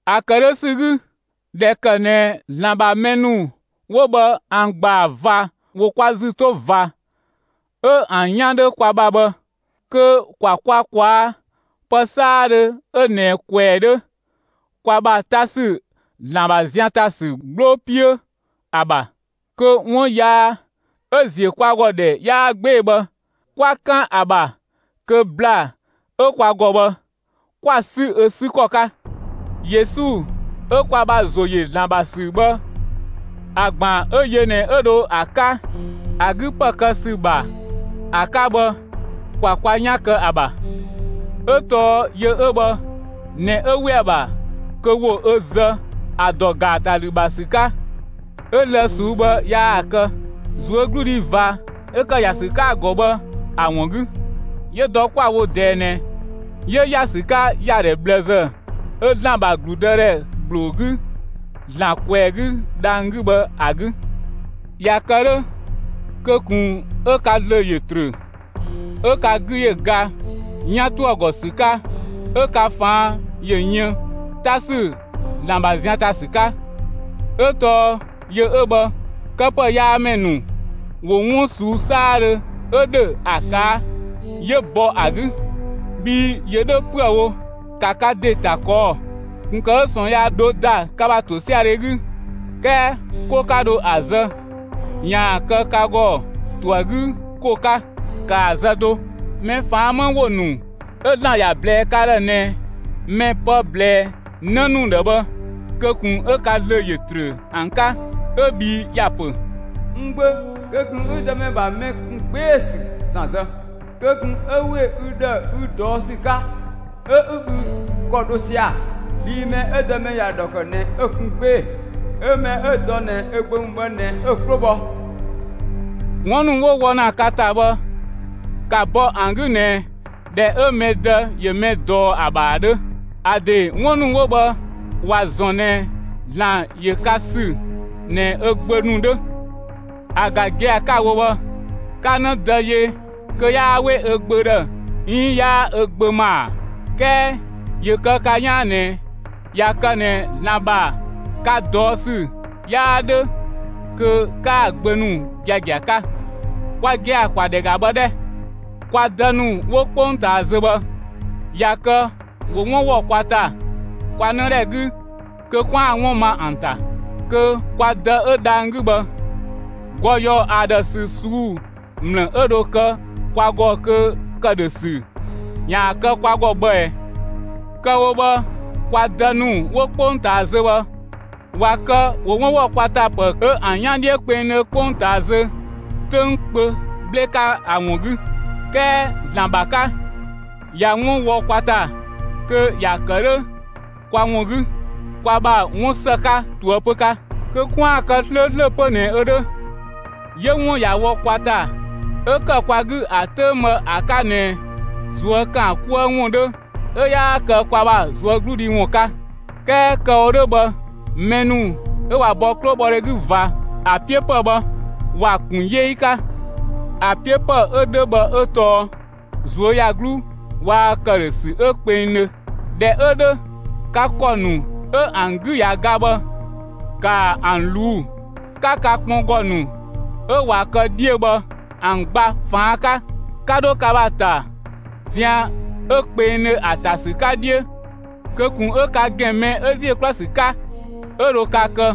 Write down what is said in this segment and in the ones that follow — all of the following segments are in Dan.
‑A ‑kë 'dhö ‑sü 'gü, ꞊dhɛ ‑kë ꞊nɛ ‑Zlan ‑bha mɛ ‑nu 'wo bhë ‑an ‑gbaa ꞊va ‑wo kwa ‑zü 'to ꞊va, 'ö ‑an 'yan 'dhö kwa ‑bha bhë, kö ‑kwa kwa ꞊kwaa' pë 'saadhö 'ö ꞊nɛ ꞊kwɛɛ‑ 'dhö, kwa ‑bha ‑ta ‑sü ‑Zlan ‑bha zian ‑ta ‑sü 'gbloo 'piö ‑a ‑bha; kö 'wun yaa 'ö ‑ziö kwa ‑gɔ ‑dhɛ 'yaa 'gbee‑ bhë, 'kwa 'kan ‑a ‑bha kö ‑bla 'ö kwa ‑gɔ bhë, 'kwa‑ 'sü ö 'sü ‑kɔ 'ka. Yesu 'ö kwa ‑bha ‑zo ‑yö ‑Zlan ‑bha ‑sü bhë ‑a ‑gbaan 'ö yö ꞊nɛ 'ö dho ‑a 'ka ‑a 'gü ‑pë kë ‑sü ‑bha ‑a 'ka bhë, ‑kwa kwa 'yan kë ‑a ‑bha. 'Ö tɔɔ yö 'ö bhë ꞊nɛ 'ö ‑we ‑a ‑bha kö ‑wo ö zë ‑a ‑dɔ ‑gaatalü ‑bha ‑sü 'ka; 'ö‑ lë‑ ꞊suu'‑ bhë yaa‑ kë, ꞊zuögludhi ꞊va 'ö ‑kë ‑ya ‑sü 'ka‑ ‑gɔ bhë ‑a ‑wun 'gü. 'Yö dɔ 'kwa‑ wo ꞊dɛɛ ꞊nɛ, 'yö ‑ya ‑sü 'ka ‑yadhɛ ꞊bhlëzë 'ö ‑Zlan ‑bha ‑gludëdhɛ ‑gbloo 'gü, ‑Zlan ꞊kwɛɛ‑ 'gü dhang‑ 'gü bhë ‑a 'gü. ꞊Ya kë 'dhö, kö ꞊kun 'ö ka ‑zlö ‑yö ‑trö, 'ö ka 'gü ‑yö ga 'yan ‑to ‑a ‑gɔ ‑sü 'ka 'ö ka ꞊faan' ‑yö yën 'ta ‑sü ‑Zlan ‑bha zian ‑ta ‑sü 'ka; 'ö tɔɔ yö 'ö bhë, këpëyaamɛ ‑nu ‑wo 'wun ꞊suu'‑ 'saadhö 'ö ‑dhö ‑a ꞊kaa', 'yö bɔ ‑a 'gü; bhii ‑yö 'dhö 'püë‑ wo, ‑ka ka ‑de ‑ta ꞊kɔɔ'‑, ꞊kun ‑kë 'ö ꞊sɔɔn yaa ‑dho ‑da ka ‑bha ‑tosiadhe 'gü 'kɛɛ 'ko 'ka dho ‑a zë, ‑yaan kë ka ‑gɔ ‑to ‑a 'gü ‑ko 'ka, kaa‑ zë do. Mɛ ꞊faan' 'më ‑wo ‑nu 'ö ‑Zlan ‑ya ꞊blɛɛ ka ‑dhë ꞊nɛ mɛ pë ꞊blɛɛ 'në ‑nu ‑dhë bhë kö ꞊kun 'ö ka ‑zlö ‑yö ‑trö ‑an 'ka; 'ö bhii ‑ya pö: N gbö, kö ꞊kun 'ü Dëmɛ ‑bha mɛ ‑kun 'gbee‑ ‑sü ‑san ‑zë; kö ꞊kun 'ö ‑we ü ‑dhë ü ꞊dɔɔ' ‑sü 'ka 'ö 'ü ü ‑kɔ dho sia‑. Bhii mɛ 'ö Dëmɛ ‑ya ‑dhɔ ‑kë ꞊nɛ 'ö‑ kun 'gbee‑, 'ö mɛ 'ö‑ dɔ ꞊nɛ ö gbö ‑mü bhë ꞊nɛ 'ö‑ 'klo bhɔ. 'Wun ‑nu 'wo wɔ ‑na ka ‑ta bhë ‑ka bɔ ‑an 'gü ꞊nɛ ꞊dhɛ 'ö mɛ dë ‑yö mɛ ꞊dɔɔ ‑a ‑bha ‑a 'dhö. ‑A ‑de 'wun ‑nu 'wo bhë ‑wa ‑zɔn ꞊nɛ ‑Zlan ‑yö ka ‑sü ꞊nɛ ö gbö ‑nu 'dhö. ‑A ‑ga gia‑ 'ka‑ wo bhë, 'ka 'në dë yö kö 'yaa 'we ö gbö ‑dhë 'iin 'yaa ö gbö ‑ma ‑a? 'Kɛɛ ‑yö kë ka 'yaan ꞊nɛ ꞊ya kë ꞊nɛ ‑Zlan ‑bha ka ꞊dɔɔ' ‑sü 'yaa 'dhö, kö 'kaa‑ gbö ‑nu giagia 'ka. Kwa gia‑ ‑kwa ‑dhɛ ‑ga bhë 'dhɛ! Kwa dë ‑nu 'wo 'kpongtaa zö bhë, ꞊ya kë ‑wo 'wun ‑wɔ kwa ‑ta kwa 'nëdhɛ 'gü kö 'kwaan‑ 'wun ma ‑an ‑ta. Kö kwa Dë 'ö dhang‑ 'gü bhë, ‑gɔ ‑yɔɔ ‑a ‑dhë ‑sü ꞊suu'‑ ‑mlë 'ö dho kë kwa ‑gɔ kö ‑këdhösü ‑yaan kë kwa ‑gɔ bhë ꞊ɛɛ! Kë‑ wo bhë kwa dë ‑nu 'wo 'kpongtaa zö bhë ꞊wa kë, ‑wo 'wun ‑wɔ kwa ‑ta pë 'ö ‑an 'yan 'dhiö kpengdhö 'kpongtaa zö 'töng kpö 'bhle 'ka ‑a ‑wun 'gü. 'Kɛɛ ‑Zlan ‑bha 'ka, ꞊ya 'wun wɔ kwa ‑ta, kö ‑ya ‑kë 'dhö kwa ‑wun 'gü (kwa ‑bha 'wun ‑së 'ka ꞊toëpö 'ka), kö 'kwaan‑ ‑kë 'slööslö 'pö ꞊nɛ ö 'dhö. 'Yö 'wun ꞊ya wɔ kwa ‑ta, 'ö ‑kë kwa 'gü ‑a 'töng bhë ‑a 'ka ꞊nɛ ꞊zuö' ‑kaan 'kuë ‑wun 'dhö 'ö 'yaa kë kwa ‑bha ꞊zuögludhi ‑wun 'ka. 'Kɛɛ kë‑ wo 'dhö bhë, mɛ ‑nu 'ö ꞊wa bɔ 'klobhɔdhe 'gü ꞊va, ‑a 'piö ‑pë bhë, ‑wa ‑kun 'yee 'ka. ‑A 'piö ‑pë 'ö 'dhö bhë 'ö tɔɔ ꞊zuöyagluu waa‑ ‑këdhösü 'ö kpengdhö. ꞊Dhɛ 'ö 'dhö, ka ‑kɔ ‑nu 'ö ‑an 'gü ꞊ya ga bhë, ‑ka ‑an ꞊luu', 'ka ka kpɔngɔ ‑nu 'ö ꞊wa kë 'dhiö bhë ‑an gba ꞊faan' 'ka. ‑Ka 'dho ka ‑bha ‑ta zian 'ö kpengdhö ‑a ‑ta ‑sü 'ka 'dhiö kö ꞊kun 'ö ka ‑gɛn mɛ 'ö ‑ziö 'kluë‑ ‑sü 'ka 'ö dho ka kë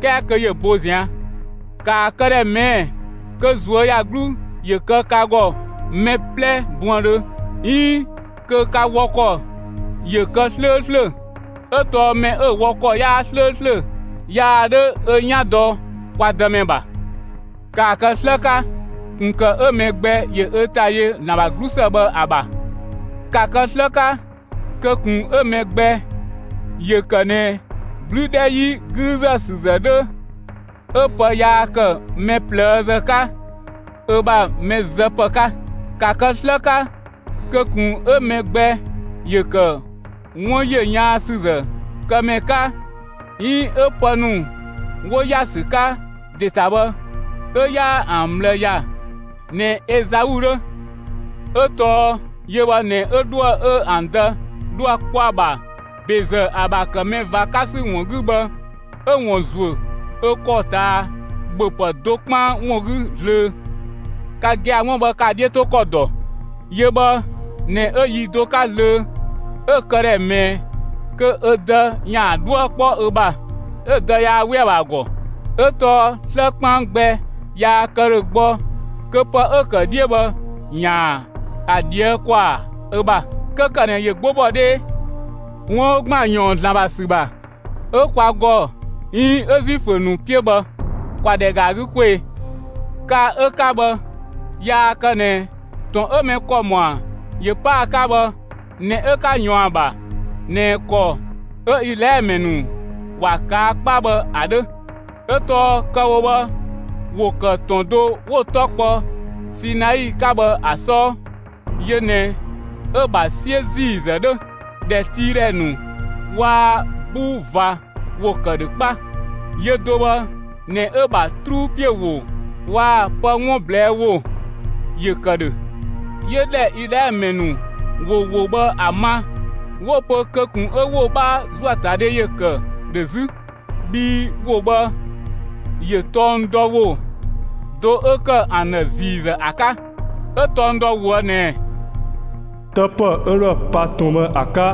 'kɛɛ kö ‑yö bo ꞊zian'. ‑Kaa këdhɛ ꞊mɛɛ'‑ kö ꞊zuöyagluu ‑yö kë ka ‑gɔ mɛ 'plɛ buëndhö 'iin kö ka wɔ ‑kɔ ‑yö kë 'slööslö, 'ö tɔɔ mɛ 'ö‑ wɔ ‑kɔ 'yaa 'slööslö yaa 'dhö ö 'yan dɔ kwa Dëmɛ ‑bha. ‑Kaa kë 'slë 'ka ꞊kun ‑kë 'ö mɛ gbɛ ‑yö ö ‑ta yö ‑Zlan ‑bha 'glusë bhë ‑a ‑bha. ‑Ka kë 'slë 'ka kö ꞊kun 'ö mɛ gbɛ ‑yö ‑kë ꞊nɛ 'blü 'dhɛ 'yi 'güüzësüzë 'dhö 'ö pë yaa ‑kë mɛ ꞊plëëzë 'ka ö ‑bha mɛ zë ‑pë 'ka. ‑Ka kë 'slë 'ka kö ꞊kun 'ö mɛ gbɛ ‑yö ‑kë 'wun ‑yö yaansüzë kë ‑mɛ 'ka 'iin 'ö pë ‑nu 'wo ‑ya ‑sü 'ka ‑de ‑ta bhë 'ö 'yaa ‑an ꞊bhlë ‑ya ꞊nɛ Ezai 'dhö; 'ö tɔɔ yö bhë ꞊nɛ 'ö 'dhuë‑ 'ö ‑an dë dhoë‑ kpɔ ‑a ‑bha ‑bezë ‑a ‑bha ‑kë mɛ ꞊va 'ka ‑sü ‑wun 'gü bhë, 'ö‑ ‑wun ‑zuö ö ‑kɔ ꞊taa ‑bhöpë do 'kpaan ‑wun 'gü zlöö. Ka gia‑ 'wun bhë, ka‑ 'dhiö 'to ‑kɔ ‑dɔ! Yö bhë ꞊nɛ 'ö yi do 'ka zlöö 'ö‑ këdhɛ ꞊mɛɛ kö ö dë ‑yaan 'dhuë‑ 'kpɔ ö ‑bha; 'ö‑ dë yaa 'we ‑a ‑bha ‑a ‑gɔ; 'ö tɔɔ 'slë 'kpaan gbɛ yaa kë ‑dhö gbɔ kö pë 'ö‑ ‑kë 'dhiö bhë ‑yaan ‑a ꞊dhië' ‑kwaa ö ‑bha; 'kö ‑kë ꞊nɛ ‑yö 'gbo bɔ 'dhee. 'Wun 'ö ‑gban ‑yɔɔn ‑Zlan ‑bha ‑sü ‑bha 'ö kwa ‑gɔ 'iin 'ö Zuifö ‑nu 'piö bhë, ‑kwa ‑dhɛ ‑ga ‑a 'gü 'kwee‑! Ka 'ö 'ka bhë yaa kë ꞊nɛ ‑tɔn 'ö mɛ ‑kɔ ‑mɔa ‑yö 'pa ‑a 'ka bhë ꞊nɛ 'ö 'ka ꞊yɔɔn ‑a ‑bha ꞊nɛ ‑kɔ 'ö Izlaɛlö ‑mɛ ‑nu ‑wa ꞊kaa' 'kpa bhë ‑a 'dhö; 'ö tɔɔ kë‑ wo bhë, ‑wo ‑kë ‑tɔn do 'wo‑ 'tɔ kpɔ Sinai 'ka bhë ‑a 'sɔɔ; yö ꞊nɛ 'ö‑ ‑bha 'siö ‑ziizë 'dhö, ‑dhɛtiidhɛ ‑nu waa‑ 'buu ꞊va ‑wo ‑kë ‑dhö 'kpa. Yö do bhë ꞊nɛ 'ö‑ ‑bha 'truu ‑piö ‑wo waa‑ pë 'wun ꞊blɛɛ' ‑wo ‑yö ‑kë ‑dhö. 'Yö ‑dhɛ 'ö Izlaɛlö ‑mɛ ‑nu ‑wo ‑wo bhë ‑a ma, 'wo‑ pö kö ꞊kun 'ö ‑wo 'bhaa ‑zuöatadhe ‑yö ‑kë ‑dhö 'zü. Bhii ‑wo bhë ‑yö tɔng dɔ ‑wo do 'ö ‑kë ‑an ‑dhë ‑ziizë ‑a 'ka; 'ö tɔng dɔ ꞊woë' ꞊nɛ: 'Të ‑pë 'ö 'dhoë‑ pa ‑tɔn bhë ‑a 'ka,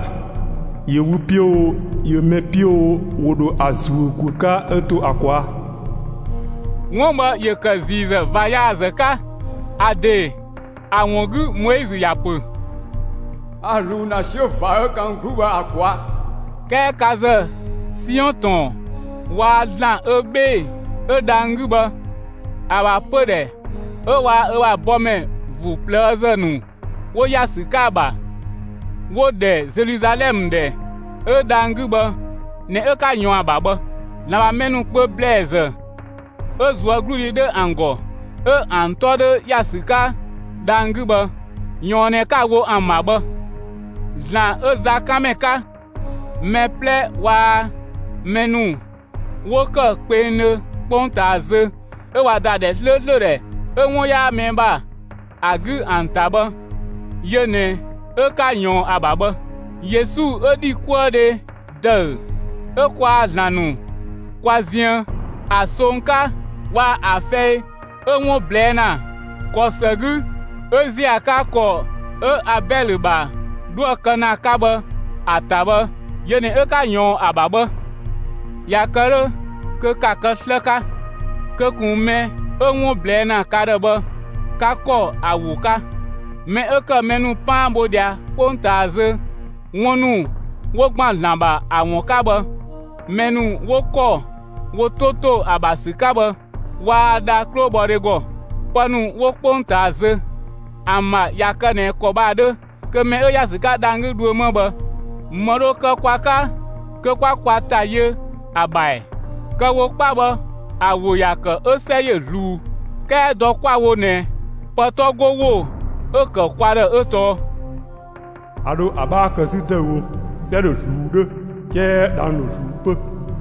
yö wü 'piö oo, ‑yö mɛ 'piö oo, ‑wo ‑dho ‑a ‑zuö ‑guö 'ka 'ö to ‑a ꞊kwaa'. 'Wun bhë ‑yö ‑kë ‑ziizë ꞊va yaazë 'ka. ‑A ‑de ‑a ‑wun 'gü Moizö ‑ya ‑pö: «A ꞊zluun ‑na 'siö ꞊va 'ö ‑kan n 'gluu bhë ‑a ꞊kwaa'.» 'Kɛɛ ka ‑zë Siɔn ‑tɔn waa‑ ‑Zlan 'ö 'bhee‑ 'ö dhang‑ 'gü bhë ‑a ‑bha pödhɛ 'ö waa‑ ö ‑bha bɔmɛ ‑vuu ꞊plëëzë ‑nu 'wo ‑ya ‑sü 'ka ‑a ‑bha, 'wo‑ ‑dhɛ Zeluzalɛmë ‑dhɛ mɛ 'ö dhang‑ 'gü bhë ꞊nɛ 'ö 'ka ꞊yɔɔn ‑a ‑bha bhë. ‑Zlan ‑bha mɛ ‑nu kpö ‑blɛɛzë 'ö ꞊zuögludhi 'dhö ‑an ‑gɔ, 'ö ‑an 'tɔ 'dhö ‑ya ‑sü 'ka dhang‑ 'gü bhë, ꞊yɔɔn ꞊nɛ 'ka‑ wo ‑an ‑bha bhë. ‑Zlan 'ö zakanmɛ 'ka, mɛ 'plɛ waa‑ mɛ ‑nu 'wo ‑kë kpengdhö 'kpongtaa zö 'ö ꞊wa ‑da ‑dhɛ 'slööslö ‑dhɛ 'ö 'wun 'yaa mɛ ‑bha ‑a 'gü ‑an ‑ta bhë, yö ꞊nɛ 'ö 'ka ꞊yɔɔn ‑a ‑bha bhë. Yesu 'ö ‑dhikuëdhe ‑dëü 'ö kwaa‑ ‑Zlan ‑nu kwa ziën ‑a song 'ka waa‑ ‑a fɛi 'ö 'wun ꞊blɛɛ' ‑na ‑kɔ ‑së 'gü 'ö ‑ziö ‑a 'ka ‑kɔ 'ö Abɛlö ‑bha 'dhoë‑ kë ‑naa 'ka bhë ‑a ‑ta bhë, yö ꞊nɛ 'ö 'ka ꞊yɔɔn ‑a ‑bha bhë. ꞊Ya kë 'dhö kö ‑ka kë 'slë 'ka! Kö ꞊kun mɛ 'ö 'wun ꞊blɛɛ' ‑na ka ‑dhë bhë, 'ka ‑kɔ ‑a ‑wo 'ka! Mɛ 'ö ‑kë mɛ ‑nu 'paan bho ꞊dhia 'kpongtaa zö 'wun ‑nu 'wo ‑gban ‑Zlan ‑bha ‑a ‑wun 'ka bhë, mɛ ‑nu 'wo ‑kɔ wo 'to ‑to ‑a ‑bha ‑sü 'ka bhë, waa dha 'klobhɔdhe ‑gɔ. Pë ‑nu 'wo 'kpongtaa zö, ‑an ‑bha ꞊ya kë ꞊nɛ ‑kɔ bhë ‑a 'dhö, kö mɛ 'ö ‑ya ‑sü 'ka dhang‑ 'gü dhuö 'ma bhë, ‑më dho kë kwa 'ka kö 'kwa kwa ‑ta yö ‑a ‑bha ‑ɛ? Kë‑ wo 'kpa bhë ‑a ‑wo ‑ya ‑kë 'ö 'sɛ ‑yö ꞊zluun. 'Kɛɛ dɔ 'kwa‑ wo ꞊nɛ pë 'tɔ 'go ‑wo 'ö‑ ‑kë kwa ‑dhë 'ö tɔɔ: A ‑dho ‑a 'bhaa kë 'zü ‑dëüwo; 'sɛ ‑dho ꞊zluun 'dhö 'kɛɛ dhang‑ ‑dho ꞊zluun 'pö.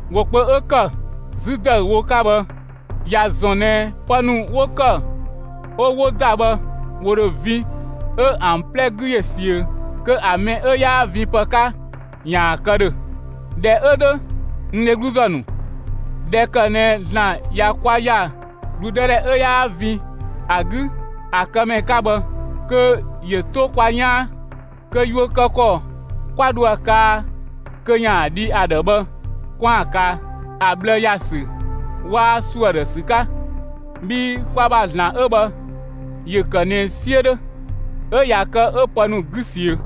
‑Wo kpö 'ö ‑kë «'zü ‑dëüwo» 'ka bhë ‑ya ‑zɔn ꞊nɛ pë ‑nu 'wo ‑kë 'ö 'wo ‑da bhë ‑wo ‑dho vin 'ö ‑an 'plɛ 'gü ‑yö ‑siö kö ‑a mɛ 'ö 'yaa vinpë 'ka ‑yaan kë ‑dhö. ꞊Dhɛ 'ö 'dhö, (n dhegluzë ‑nu,) ꞊dhɛ kë ꞊nɛ ‑Zlan ꞊ya kwa ‑ya ‑gludëdhɛ 'ö 'yaa vin ‑a 'gü ‑a këmɛ 'ka bhë, kö ‑yö 'to kwa 'yaan, kö yuö kë ‑kɔ 'kwa ‑dho ‑a kaa kö ‑yaan dhi ‑a ‑dhë bhë 'kwaan‑ kaa, ‑a ꞊bhlë ‑ya ‑sü waa‑ ‑suö ‑a ‑dhë ‑sü 'ka. Bhii kwa ‑bha ‑Zlan 'ö bhë, ‑yö ‑kë ꞊nɛ 'siö 'dhö, 'ö ꞊ya kë 'ö pë ‑nu 'gü ꞊siö.